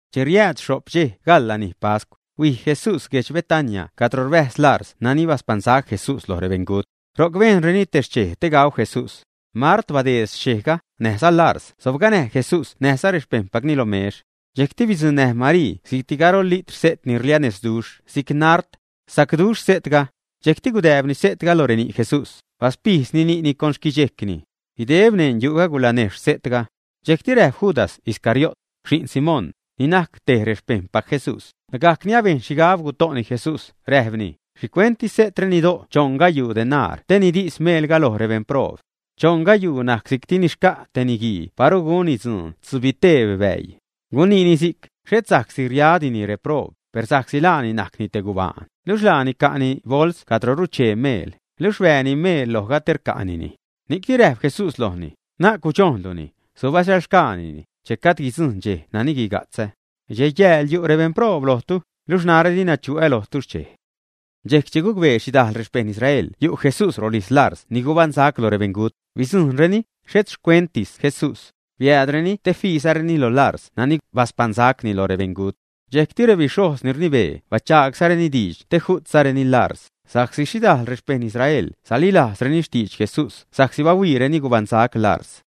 Che riäädx xho'p dxej gaḻ lanij pascw, huij Jesús guedx Betania cadro rbäjz Larz nani baspaṉsac Jesús loj rebeṉgut. Ro'c bejnreni te xchej te gau Jesús. Mart bateed xchejga, näjza Larz sobganäj Jesús näjza rexpejṉpacni lo mex. Dxejcti bidzuṉnäj Marii si'cti garol litr se't ni rlianexhduxh si'c nard. Sacduxh se'tga. Dxejcti gudääbni se'tga lo reni' Jesús, baspijdzni ni'ni con xquidxejcni. Guideb neṉ yu'ga gulanejxh se'tga. Dxejcti räjp Judas Iscariot, xi'n Simón, ni najc te rexpejṉpac Jesús, lagajc ni abejn xhigab guto'ni Jesús, räjpni: ―¿Xhicuent di se'tre nido' choṉ gayuu denar te nidis meelga loj rebeṉproob? (Choṉ gayuuga najc si'cti ni xca' te niguii paru gunni dzuun tzubiteb bäii.) Guniini si'c, xhet sa'csi riadini reproob, per sa'csi laani najcni te gubaan, luxh laani ca'ni bols cadro ruchee meel, luxh rbääni meel lojga te rca'nini. Ni'cni räjp Jesús lojni: ―Na'c gudxojnluni; subasäḻxgaanini, che gajd guidzujṉ dxej nani guiga'tzä. Dxej-yääl yu' rebeṉproob lojtu, luxh narä dina chuä lojtu xchej. Dxejc che gucbee xhidajl xpejṉ Israel yu' Jesús rolijz Larz ni gubaṉsac lo rebeṉgut, bidzujṉreni, xhet xcuentis Jesús. Biäädreni te fiizareni loj Larz nani baspaṉsacni lo rebeṉgut. Dxejcti rebixhojz ni rnibee bachaagzareni diidx te ju'tzareni Larz, sa'csi xhidajl rexpejṉ Israel salilajzreni xtidx Jesús sa'csi bahuiireni gubaṉsac Larz.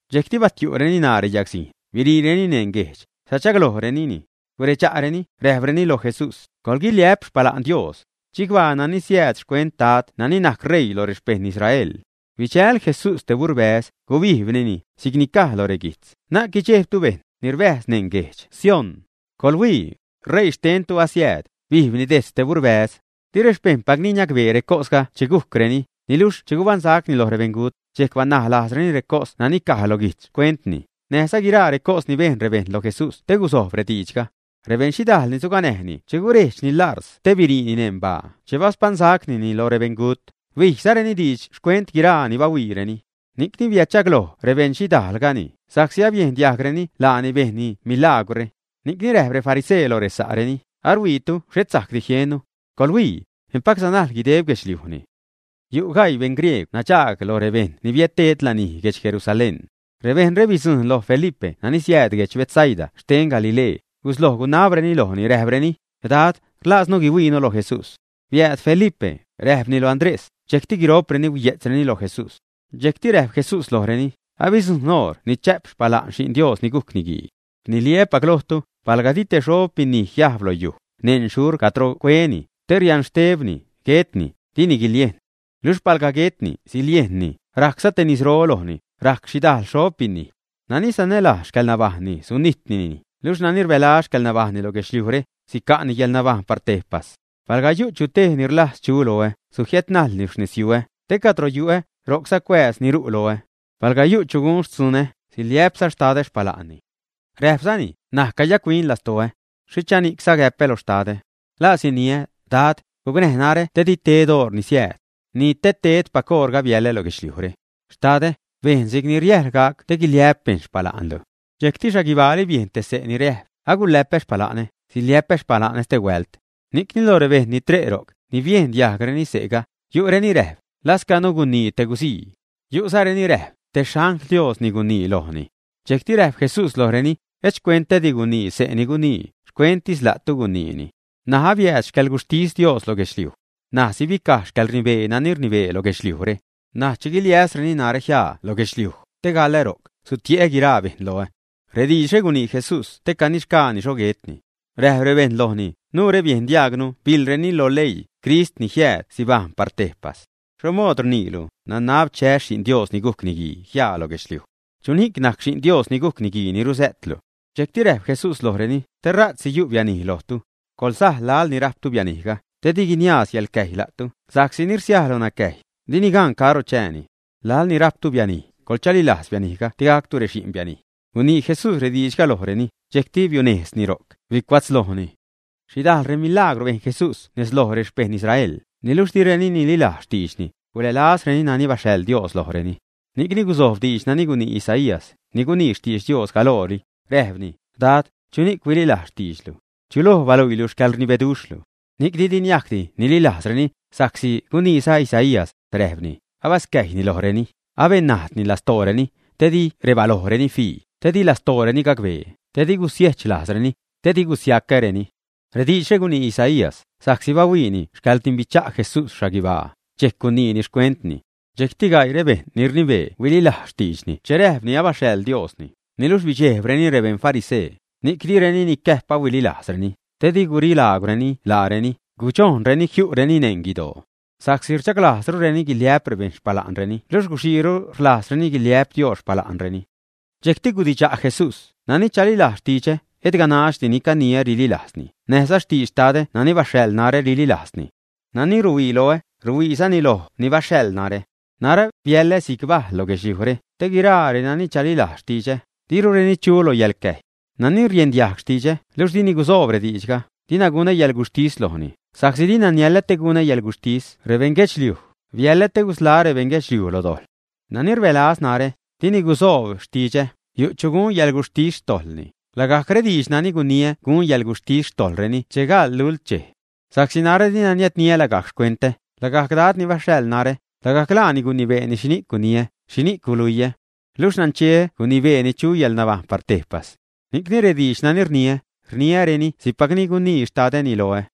dxejcti batiu'reni ṉaa reyagzijn, biriireni neṉ guejdx, sachaglojrenini. Guredxa'reni, räjpreni lo Jesús: ―¡Coḻguiliä'p xpala'n Dios! ¡Chicbaa nani siääd xcuent Dad nani najc ṟeii lo rexpejṉ Israel! Bidxäl Jesús te burbäz, gubijbnini, si'cni caj lo reguijtz: Na'c guidxejbtu, bejṉ ni rbäjz neṉ guedx Sión. ¡Coḻhuii! Reii xtentu asiääd, bijbni dejtz te burbäz. Di rexpejṉpacni niacbee recosga che gujcreni, niluxh che gubaṉsacni loj rebeṉgut, dxejc banaj lajzreni recos nani caj lo guijtz xcuentni, näjza guiraa recos ni bejn rebejṉ lo Jesús te guzojb rediidxga. Rebeṉ xhidajl ni suganäjni che gurejdxni Larz te biriini neṉ baa che baspaṉsacnini lo rebeṉgut, bijzareni diidx xcuent guiraa ni bahuiireni. Ni'cni biädchagloj rebeṉ xhidajlgani, sa'csi abiejn diajgreni laani bejnni milagwrre. Ni'cni räjp refarisee lo sa'reni: ―Aruhuiitu xhet sajcdi jieṉnu. ¡Coḻhuii! Empac sanajl guideb guedxliujni. Yu' gaii beṉgriegw nadxaag lo rebejṉ ni biädted lanij guedx Jerusalén. Rebejṉre bidzujṉ loj Felipe nani siääd guedx Betsaida xten Galilee, gusloj gunabreni lojni, räjpreni: ―Dad, rlaaznu guihuiinu lo Jesús. Biääd Felipe, räjpni loj Andrés, dxejcti guiro'preni huiye'tzreni lo Jesús. Dxejcti räjp Jesús lojreni: ―Abidzujṉ oṟ ni chä'p xpala'n Xi'n Dios ni gujc Niguii. Rniliä́pac lojtu, palga di te xob binij jiajb lo yuj, neṉ xhurc cadro cueni, te rianxtebni, guetni, dini guiliejn. Luxh palga guetni, siliejnni, rajcza te nisro lojni, rajc xhidajl xob binij. Nani sanälajz xcäḻnabajṉni, sunijtnini, luxh nani rbälaz xcäḻnabajṉni lo guedxliujre, sica'ni yäḻnabajṉ par tejpas. Palga yu' chu tej ni rlajz chu loä, sujiädnajlni xnezyuä, te cadro yu'ä, ro'cza cuääz ni ru' loä. Palga yu' chu gun xtzunä, siliä'pza Xtadä xpala'nni. Räjpzani: ―N̲aj cayac-huin lastoä. ¿Xhichani'cza gäpä lo Xtadä? ¿La siniä: Dad, gucnäj narä te di tedä oṟ ni siääd? Ni te tedäpac oṟga biälä lo guedxliujre. Xtadä, bejn si'cni riäjl gac te guiliä'p bejṉ xpala'nlu. Dxejcti xhaguibaali biejn te xse' te ni räjp: ―Agulä'pä xpala'nä, siliä'pä xpala'nä stehuält. Ni'cni lo rebejṉ ni tre' ro'c, ni biejn diajgreni se'ga, yu' reni räjp: ―Lascanu gunii te guzii. Guyu'zareni räjp: ―Te xangl Dios ni gunii lojni. Dxejc räjp Jesús lojreni: ―Et xcuentädi gunii xse' ni gunii, xcuenttis la'tu guniini. N̲aj abiääd xcäḻguxhtis Dios lo guedxliuj. N̲aj sibicaj xcäḻrnibee nani rnibee lo guedxliujre. N̲aj, che guiliäsreni narä jiaa lo guedxliuj, te gaḻä ro'c, sutie'ä guiraa bejṉ loä. Rediidxre gunii Jesús te canixgaani xho guetni. Räjp rebejṉ lojni: ―Nuure biejn diajgnu biḻreni lo leii, Crist ni jiääd sibajṉ par tejpas. ¿Xho mood rniilu, nanab chäs Xi'n Dios ni gujc Niguii jiaa lo guedxliuj? ¿Chuxhni'c najc Xi'n Dios ni gujc Niguii ni ruzä'tlu? Dxejcti räjp Jesús lojreni: ―Stera'tsi yu' bianij lojtu. Coḻsaj laḻ ni rajptu bianijga, te di guiniaaz yäḻxcäjy la'tu, sa'csi ni rsiaj loj nacäjy, dini gan caro chääni. Laḻ ni rajptu bianij, coḻchalilajz bianijga te gactu rexi'n bianij. Gunii Jesús rediidxga lojreni, dxejcti biunejzni ro'c, bicuatzlojni. Xhidajl remilagwr bejn Jesús nez loj rexpejṉ Israel, niluxh direni nililajz xtiidxni, gulälazreni nani baxhaḻ Dios lojreni. Ni'cni guzojb diidx nani gunii Isaías, ni gunii xtidx Dios galoro, räjpni: Dad, ¿chuni'c huililajz xtiidxlu? ¿Chuloj baluiilu xcäḻrnibeduxhlu, ä? Ni'cni di niajcdi nililajzreni, sa'csi guniiza Isaías, räjpni: Abascäjyni lojreni, abennajdni lastooreni, te di rebalojreni fii, te di lastooreni gacbee, te di gusiejch lajzreni, te di gusiacäreni. Rediidxre gunii Isaías, sa'csi bahuiini xcäḻrdimbicha' Jesús xhaguibaa, dxejc guniini xcuentni. Dxejcti gaii rebejṉ ni rnibee huililajz xtiidxni che räjpni abaxhaḻ Diosni, niluxh bidxejbreni rebeṉ farisee, ni'c direni nicäjp ahuililajzreni, te di gurilaagwreni laareni, gudxojnreni jiu'reni neṉ guidoo. Sa'csi rdxaglajzrureni guiliä'p rebejṉ xpala'nreni luxh guxiiru rlajzreni guiliä'p Dios xpala'nreni. Dxejcti gudidxa' Jesús: ―Nani chalilajz xtidxä, et ganaxdi ni caniä rililajzni, näjza xtidx Xtadä nani baxhaḻ narä rililajzni. Nani ruhuii loä, ruhuiizani loj ni baxhaḻ narä. Narä biäḻä si'c bajl lo guedxliujre, te guiraa renani chalilajz xtidxä, dirureni chu lo yäḻcäjy. Nani riendiajg xtidxä, luxh dini gusoob rediidxga, dina gunä yäḻguxhtis lojni, sa'csi dina niälä te gunä yäḻguxhtis rebeṉguedxliuj, biäḻä te gusḻaä́ rebeṉ guedxliuj lo dojḻ. Nani rbälaz narä, ni di gusoob xtidxä, yu' chu gun yäḻguxhtis xtojḻni; lagajc rediidx nani guniä gun yäḻguxhtis xtojḻreni che gaḻ lult dxej. Sa'csi narä dina niädniä lagajc xcuentä, lagajc Dad ni baxhaḻ narä, lagajc laani gunibeeni xhini'c guiniä, xhini'c guluiä. Luxh nancheä gunibeeni chu yäḻnabajṉ par tejpas. Ni'cni rediidx nani rniä, rniäreni si'cpacni gunii Xtadäni loä.